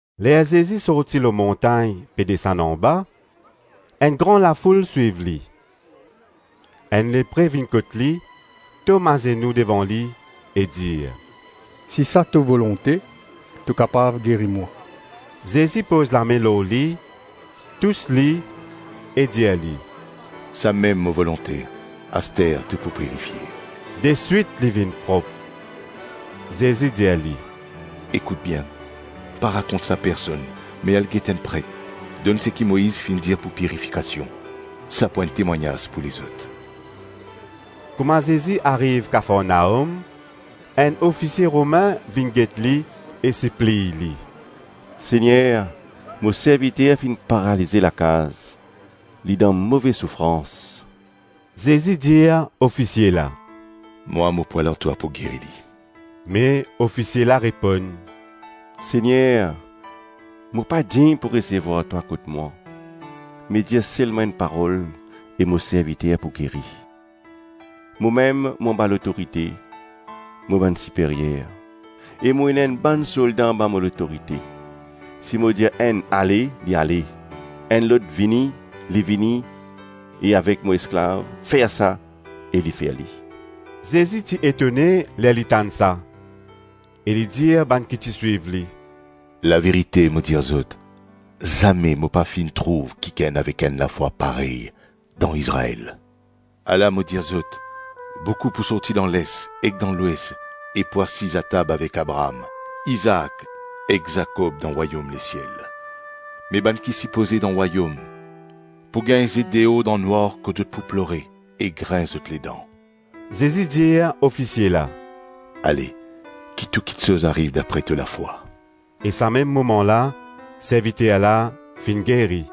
Ler Zezi sorti lor montagn pe desann anba, enn gran lafoul swiv li. Enn lepre vinn kot li, tom azenou devan li e dir, “Si sa to volonte, to kapav geri mwa.” Zezi poz lame lor li, tous li, e dir li, “Samem mo volonte, aster to pou pirifie.” Deswit li vinn prop. Zezi dir li, “Ekout bien, pa rakont sa personn, me al get enn pret, donn seki Moiz finn dir pou pirifikasion; sa pou enn temwagnaz pou lezot.” Kouma Zezi ariv Kafarnaom, enn ofisie Romin vinn get li e sipliy li, “Segner, mo serviter finn paralize lakaz, li dan move soufrans.” Zezi dir ofisie la, “Mwa, mo pou al ar twa, pou geri li.” Me ofisie la reponn, “Segner, mo pa dign pou resevwar twa kot mwa, me dir selma enn parol e mo serviter pou geri. Momem, mo anba lotorite mo bann siperyer, e mo ena enn bann solda anba mo lotorite; si mo dir enn, ‘Ale’ li ale, enn lot ‘Vini’ li vini e avek mo esklav ‘Fer sa’ e li fer li.” Zezi ti etone ler li tann sa, e li dir bann ki ti swiv li, “Laverite mo dir zot, zame mo pa finn trouv kikenn avek enn lafwa parey dan Izrael.” Ala mo dir zot: boukou pou sorti dan les ek dan lwes e pou asiz atab avek Abraam, Izaak, ek Zakob dan rwayom lesiel. Me bann ki sipoze dan rwayom, pou gagn zet deor dan nwar kot zot pou plore ek grins zot ledan. Zezi dir ofisie la, “Ale, ki tou kiksoz ariv dapre to lafwa.” E sa mem moman la serviter la finn geri.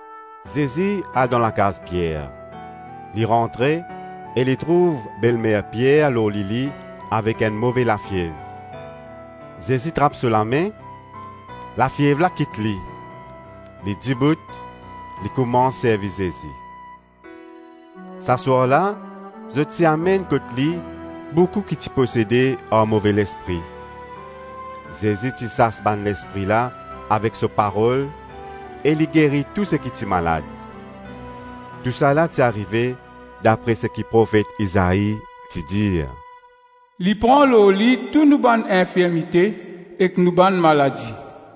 Zezi al dan lakaz Pier, li rantre e li trouv belmer Pier lor lili avek enn move lafiev Zezi trap so lame, lafiev la kit li, li dibout li koumans servi Zezi. Sa swar la, zot ti amenn kot li boukou ki ti posede ar move lespri; Zezi ti sas bann lespri la avek so parol e li geri tou seki ti malad. Tousala ti arive dapre seki profet Izai ti dir, “Li pran lor li tou nou bann infirmite ek nou bann maladi.”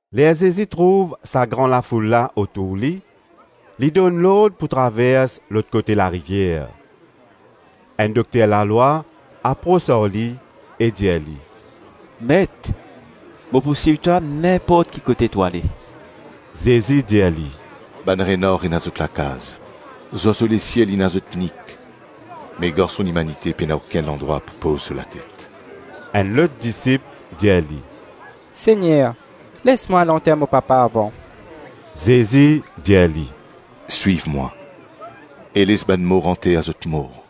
Ler Zezi trouv sa gran lafoul la otour li, li donn lord pou travers lot kote larivier. Enn dokter lalwa apros ar li e dir li, “Met, mo pou swiv twa ninport ki kote to ale.” Zezi dir li, “Bann renar ena zot lakav, zwazo lesiel ena zot nik, me Garson Limanite pena okenn landrwa pou poz so latet.” Enn lot disip dir li, “Segner, les mwa al anter mo papa avan.” Zezi dir li, “Swiv mwa, e les bann mor anter zot mor.”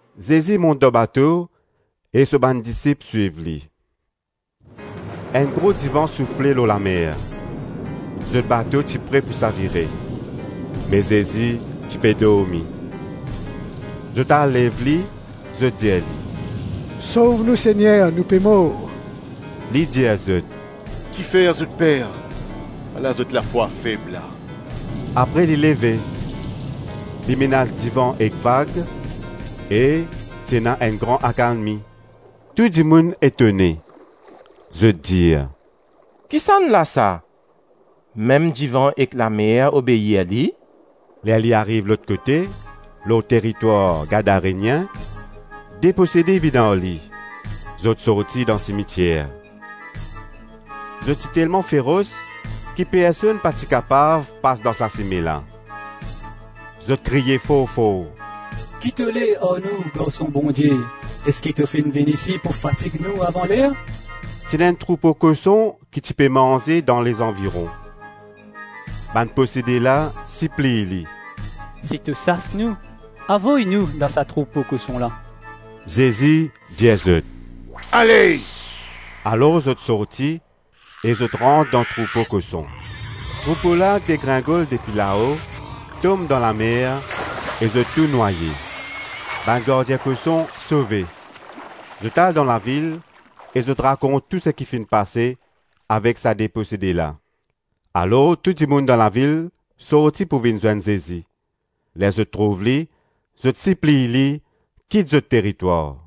Zezi mont dan bato, e so bann disip swiv li. Enn gro divan soufle lor lamer, zot bato ti pre pou savire, me Zezi ti pe dormi. Zot al lev li, zot dir li, “Sov nou, Segner, nou pe mor.” Li dir zot, “Kifer zot per? Ala zot lafwa feb la.” Apre li leve, li menas divan ek vag e ti ena enn gran akalmi. Tou dimoun etone, zot dir, “Kisannla sa? Mem divan ek lamer obeir li.” Ler li ariv lot kote, lor teritwar Gadarenien, de posede vinn ar li; zot sorti dan simitier. Zot ti telman feros ki personn pa ti kapav pas dan sa sime la. Zot kriye for-for, “Ki to le ar nou, Garson Bondie? Eski to finn vinn isi pou fatig nou avan ler?” Ti ena enn troupo koson ki ti pe manze dan lezanviron. Bann posede la sipliy li, “Si to sas nou, avoy nou dan sa troupo koson la” Zezi dir zot, “Ale!” Alor zot sorti e zot rant dan troupo koson. Troupo la degringol depi lao, tom dan lamer e zot tou nwaye. Bann gardien koson sove, zot al dan lavil e zot rakont tou seki finn pase avek sa de posede la. Alor tou dimoun dan lavil sorti pou vinn zwenn Zezi; ler zot trouv li, zot sipliy li kit zot teritwar.